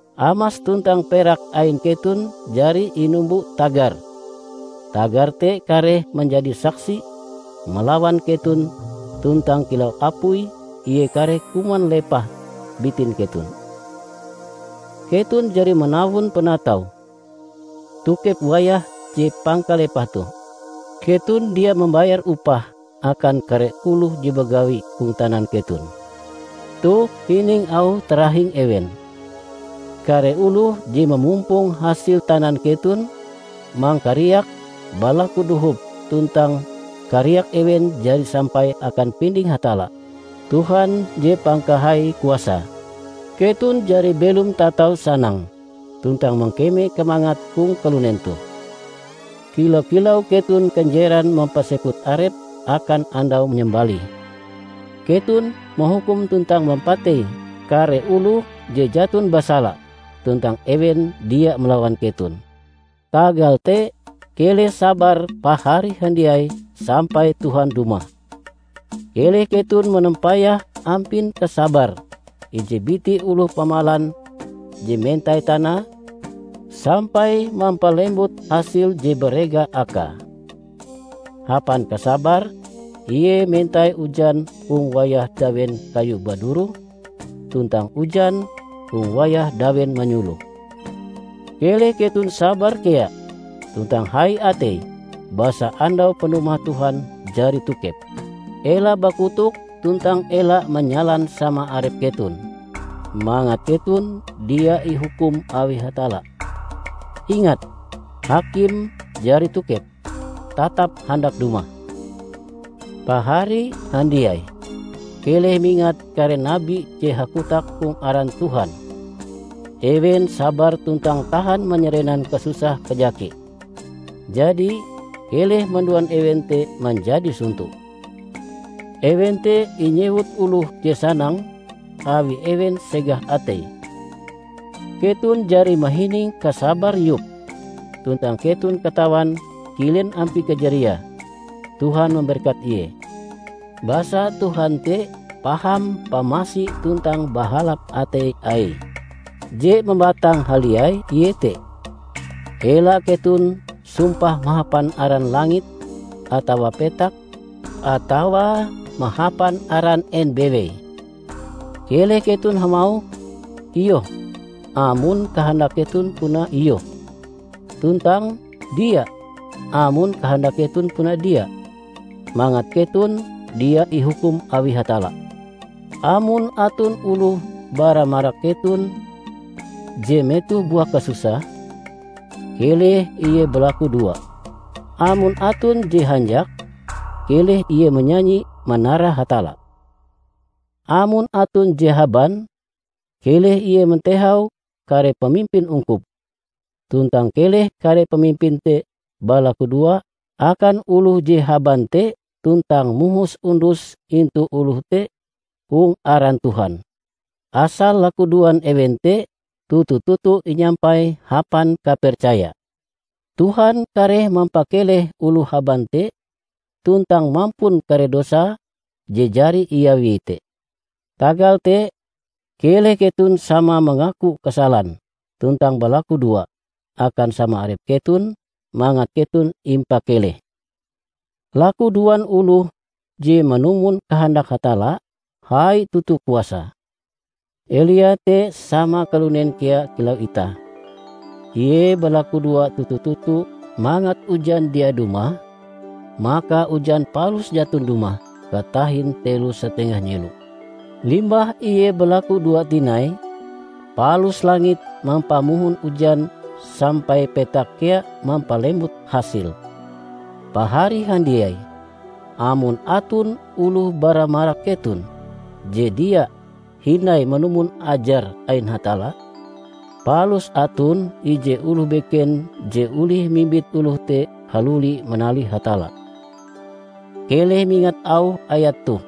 Amas tuntang perak ain keton jari inumbo tagar; tagar te kareh manjadi saksi malawan keton tuntang kilau apui ie kareh kuman lepah bitin keton. Keton jari manawon panatau tokep wayah je pangkalepahe toh. Keton dia mambayar upah akan kare oloh je bagawi hong tanan keton. Toh hining auh tarahing ewen! Kare oloh je mamumpong hasil tanan keton, mangkariak balaku dohop tuntang kariak ewen jari sampai akan pinding Hatalla, Tuhan je Pangkahai Kuasae. Keton jari belom tatau sanang tuntang mangkeme kamangat hong kalunen toh. Kila-kilau keton kanjeran mampaseput arep akan andau manyambalih. Keton mahukum tuntang mampatei kare oloh je jaton basala, tuntang ewen dia malawan keton. Tagal te, keleh sabar pahari handiai, sampai Tuhan dumah. Keleh keton manampayah ampin kasabar ije biti oloh pamalan je mentai tanae sampai mampalembut hasil je barega akae. Hapan kasabare ie mentai ujan hong wayah dawen kayu baduroh tuntang ujan hong wayah dawen manyuloh. Keleh keton sabar kea tuntang hai atei, basa andau panumah Tuhan jari tokep. Ela bakotok tuntang ela manyalan sama arep keton, mangat keton dia ihukum awi Hatalla. Ingat! Hakim jari tokep, tatap handak dumah. Pahari handiai! Keleh mingat kare nabi je hakotak hong aran Tuhan. Ewen sabar tuntang tahan manyarenan kasusah kajake. Jadi, keleh manduan ewen te manjadi sonto. Ewen te inyewut oloh je sanang awi ewen segah ateie. Keton jari mahining kasabar Yob, tuntang keton katawan kilen ampie kajariae Tuhan mamberkat ie. Basa Tuhan te paham pamasi tuntang bahalap atei Aie. Je mambatang haliai iete: ela keton sumpah mahapan aran langit atawa petak atawa mahapan aran en bewei. Keleh keton hamauh "Iyoh" amon kahandak keton puna iyoh, tuntang "Dia" amon kahandak keton puna dia; mangat keton dia ihukum awi Hatalla. Amon aton oloh bara marak keton je metoh buah kasusah, keleh ie balakudoa. Amon aton je hanjak, keleh ie manyanyi manara Hatalla. Amon aton je haban, keleh ie mantehau kare pamimpin ungkup. Tuntang keleh kare pamimpin te balakudoa akan oloh je haban te tuntang mohos undus intu oloh te hong aran Tuhan. Asal lakudoan ewen te toto-toto inyampai hapan kapercaya, Tuhan kareh mampakeleh oloh haban te, tuntang mampun kare dosa je jari iawie te. Tagal te, keleh keton sama mangaku kasalan tuntang balakudoa akan sama arep keton mangat keton impakeleh. Lakudoan oloh je manumon kahandak Hatalla, hai toto kuasae. Elia te sama kalunen kea kilau itah. Ie balakudoa toto-toto mangat ujan dia dumah, maka ujan palus jaton dumah katahin telo satengah nyelo. Limbah ie balakudoa tinai, palus langit mampamohon ujan sampai petak kea mampalembut hasil. Pahari handiai! Amon aton oloh bara marak keton je dia hindai manumon ajar ain Hatalla, palus aton ije oloh beken je olih mimbit oloh te haluli manalih Hatalla, keleh mingat auh ayat toh: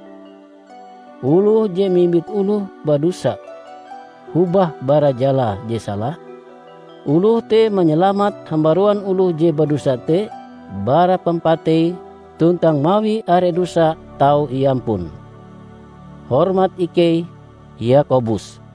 Oloh je mimbit oloh badosa hobah bara jalae je sala, oloh te manyalamat hambaruan oloh je badosa te bara pampatei tuntang mawi are dosa tau iampun. Hormat ikei, Yakobus